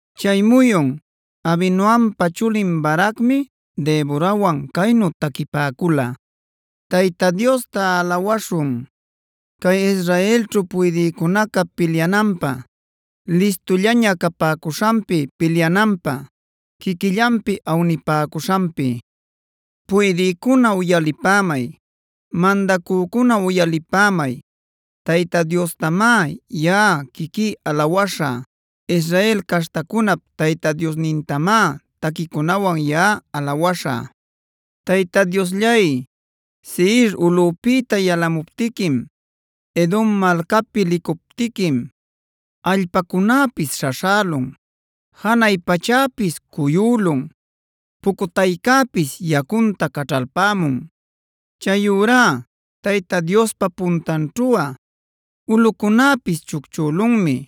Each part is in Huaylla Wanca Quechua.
Chay muyun Abinoampa chulin Baracmi Deborawan caynu taquipäcula: “Tayta Diosta alawäśhun, cay Israelćhu puydïcunaca pilyananpä listullaña capäcuśhanpi; pilyananpä quiquillanpi awnipäcuśhanpi. ¡Puydïcuna uyalipämay! ¡Mandacücuna uyalipämay! Tayta Diostamá yaꞌa quiquí alawäśhä. Israel caśhtacunap Tayta Diosnintamá taquicunawan yaꞌa alawäśhä. “Tayta Diosllay, Seir ulꞌupïta yalamuptiquim, Edom malcapi licuptiquim, allpacunäpis śhaśhälun, janay pachäpis cuyülun, pucutaycäpis yacunta caćhalpämun. Chayurá Tayta Diospa puntanćhuꞌa ulꞌucunäpis chucchülunmi.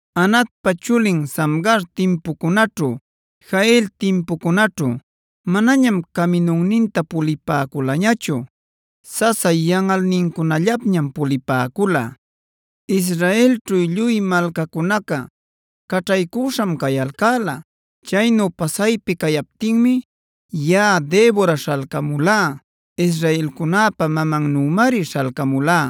Anatpa chulin Samgarb timpucunaćhu, Jael timpucunaćhu manañam caminunninta pulipäculañachu; sasa yanꞌalnincunallapñam pulipäcula. Israelćhu lluy malcacunaca caćhaycüśham cayalcäla. Chaynu pasaypi cayaptinmi yaꞌa Debora śhalcamulá, israelcunäpa mamannümari śhalcamulá.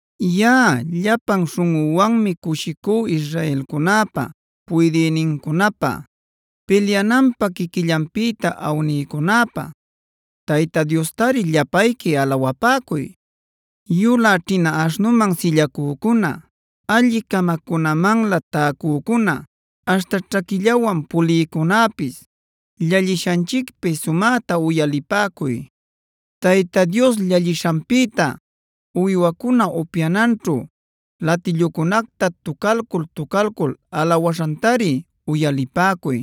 “Yaꞌa llapan śhunꞌüwanmi cushicú israelcunäpa puydïnincunapä, pilyananpä quiquillanpïta awnïcunäpä. ¡Tayta Diostari llapayqui alawapäcuy! “Yulä ćhina aśhnuman sillacücuna, alli-camacunamanlä täcücuna, aśhta ćhaquillawan pulïcunäpis llallishanchicpi sumäta uyalipäcuy. Tayta Dios llallishanpïta uywacuna upyananćhu latillucunacta tucalcul-tucalcul alawäśhantari uyalipäcuy;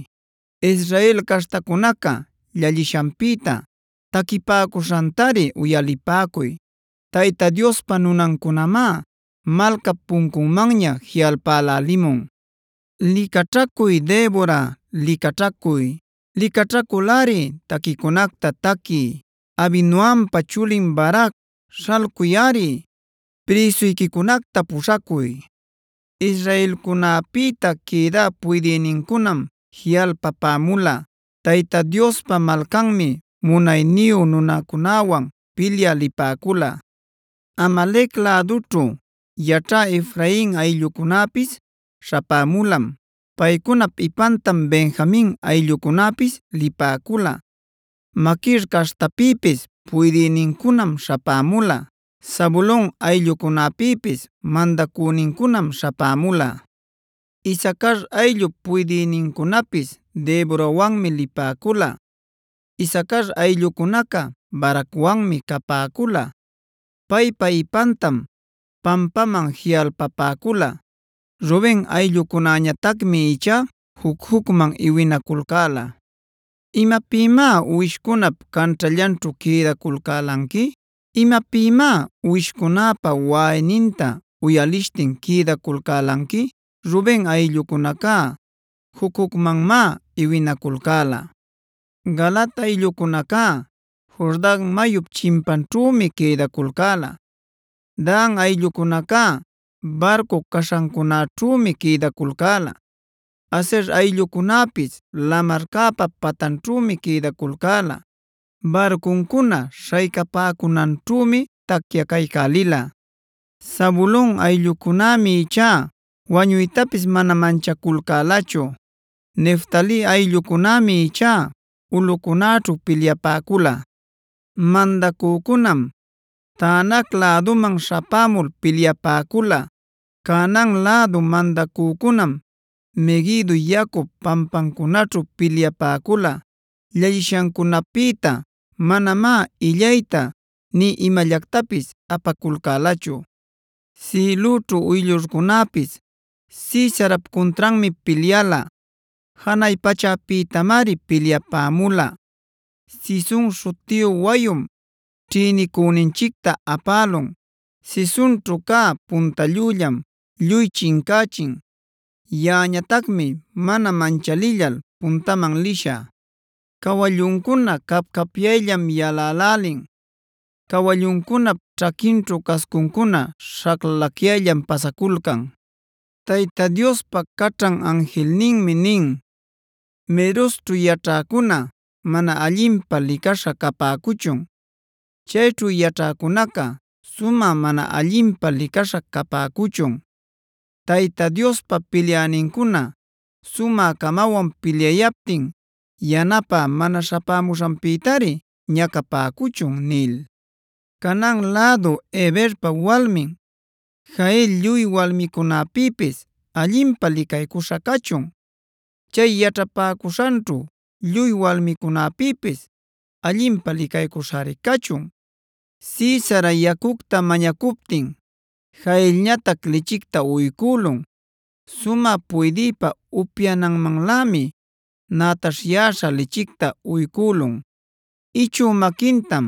Israel caśhtacunaca llallishanpïta taquipäcuśhantari uyalipäcuy. Tayta Diospa nunancunamá malcap puncunmanña jiꞌalpälälimun. “¡Licaćhacuy Debora, licaćhacuy! ¡Licaćhaculꞌari taquicunacta taquiy! ¡Abinoampa chulin Barac śhalcuyꞌari; prïsuyquicunacta puśhacuy! “Israelcunäpïta quïdä puydïnincunam jiꞌalpapämula, Tayta Diospa malcanmi munayniyu nunacunäwan pilyä lipäcula. Amalec lädućhu yaćhä Efrain ayllucunäpis śhapämulam. Paycunap ipantam Benjamin ayllucunäpis lipäcula. Maquir caśhtapïpis puydïnincunam śhapämula. Zabulon ayllucunapïpis mandacünincunam śhapämula. Isacar ayllup puydïnincunapis Deborawanmi lipäcula. Isacar ayllucunaca Baracwanmi capäcula; paypa ipantam pampaman jiꞌalpapäcula. Ruben ayllucunäñatacmi ichá juc-jucman iwinaculcäla. ¿Imapïmá uwishcunap canćhallanćhu quïdaculcälanqui? ¿Imapïmá uwishcunäpa waꞌayninta uyalishtin quïdaculcälanqui? ¡Ruben ayllucunaca juc-jucmanmá iwinaculcäla! “Galaad ayllucunaca Jordan mayup chimpanćhümi quïdaculcäla. Dan ayllucunaca barcu caśhancunäćhümi quïdaculcäla. Aser ayllucunäpis lamarcäpa patanćhümi quïdaculcäla, barcuncuna śhaycapäcunanćhümi tacyacaycälila. Zabulon ayllucunämi ichá wañuytapis mana manchaculcälachu; Neftali ayllucunämi ichá ulꞌucunäćhu pilyapäcula. “Mandacücunam Taanac läduman śhapämul pilyapäcula; Canaan lädu mandacücunam Meguido yacup pampamcunaćhu pilyapäcula; llallishancunapïtá manamá illayta nï imallactapis apaculcälachu. Sïlüćhu uyllurcunäpis Sisarap cuntranmi pilyala; janay pachäpïtamari pilyapämula. Cison śhutiyu wayum ćhïnicüninchicta apälun; Cisonćhu cä punta llüllam lluy chincächin. Yaꞌañatacmi mana manchalillal puntaman lishä. “Cawalluncuna cap-capyayllam yalälälin; cawalluncunap ćhaquinćhu cascuncuna śhaclallacyayllam pasaculcan. Tayta Diospa caćhan anjilninmi nin: ‘Merozćhuc yaćhäcuna mana allinpä licaśha capäcuchun. Chayćhu yaćhäcunaca sumä mana allinpä licaśha capäcuchun. Tayta Diospa pilyänincuna sumä-camawan pilyayaptin yanapä mana śhamuśhanpïtari ñacapäcuchun’ nil. “Canaan lädu Heberpa walmin Jael lluy walmicunapïpis allinpä licaycuśha cachun; chay yaćhapäcuśhanćhu lluy walmicunapïpis allinpä licaycuśhari cachun. Sisara yacucta mañacuptin Jaelñatac lichicta uycülun; sumä puydïpa upyananmanlämi nätaśhyäśhad lichicta uycülun. Ichü maquintam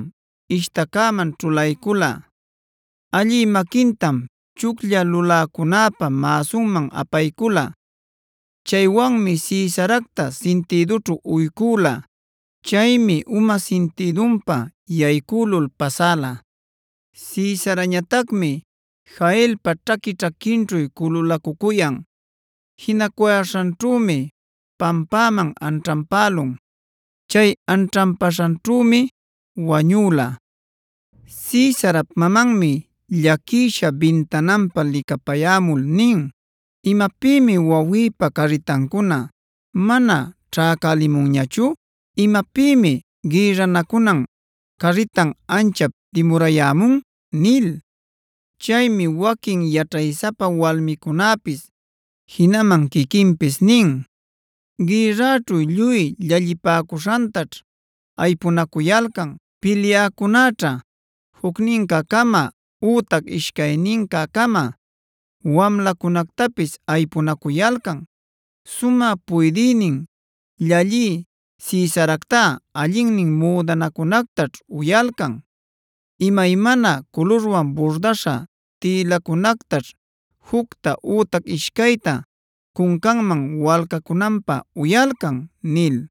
ishtacäman ćhulaycula; allï maquintam chuclla luläcunäpa mäsunman apaycula. Chaywanmi Sisaracta sintïdućhu uycüla. Chaymi uma sintïdunpa yaycülul pasäla. Sisarañatacmi Jaelpa ćhaqui-ćhaquinćhu cululacucuyan; jinacuyäśhanćhümi pampäman anćhanpälun, chay anćhanpaśhanćhümi wañüla. “Sisarap mamanmi llaquisha bintananpa licapayämul nin: ‘¿Imapïmi wawïpa carritancuna mana ćhäcälimunñachu? ¿Imapïmi gïrranacunan carritan anchap dimurayämun?’ nil. “Chaymi waquin yaćhaysapa walmicunäpis, jinaman quiquinpis nin: ‘Gïrraćhu lluy llallipäcuśhantaćh aypunacuyalcan. Pilyäcunäćha jucnincä-cama ütac ishcaynincä-cama wamlacunactapis aypunacuyalcan. Sumä puydïnin llallï Sisaractá allinnin müdanacunactaćh uyalcan, imaymana culurwan burdäśha tïlacunactaćh jucta ütac ishcayta cuncanman walcacunanpä uyalcan’ nil.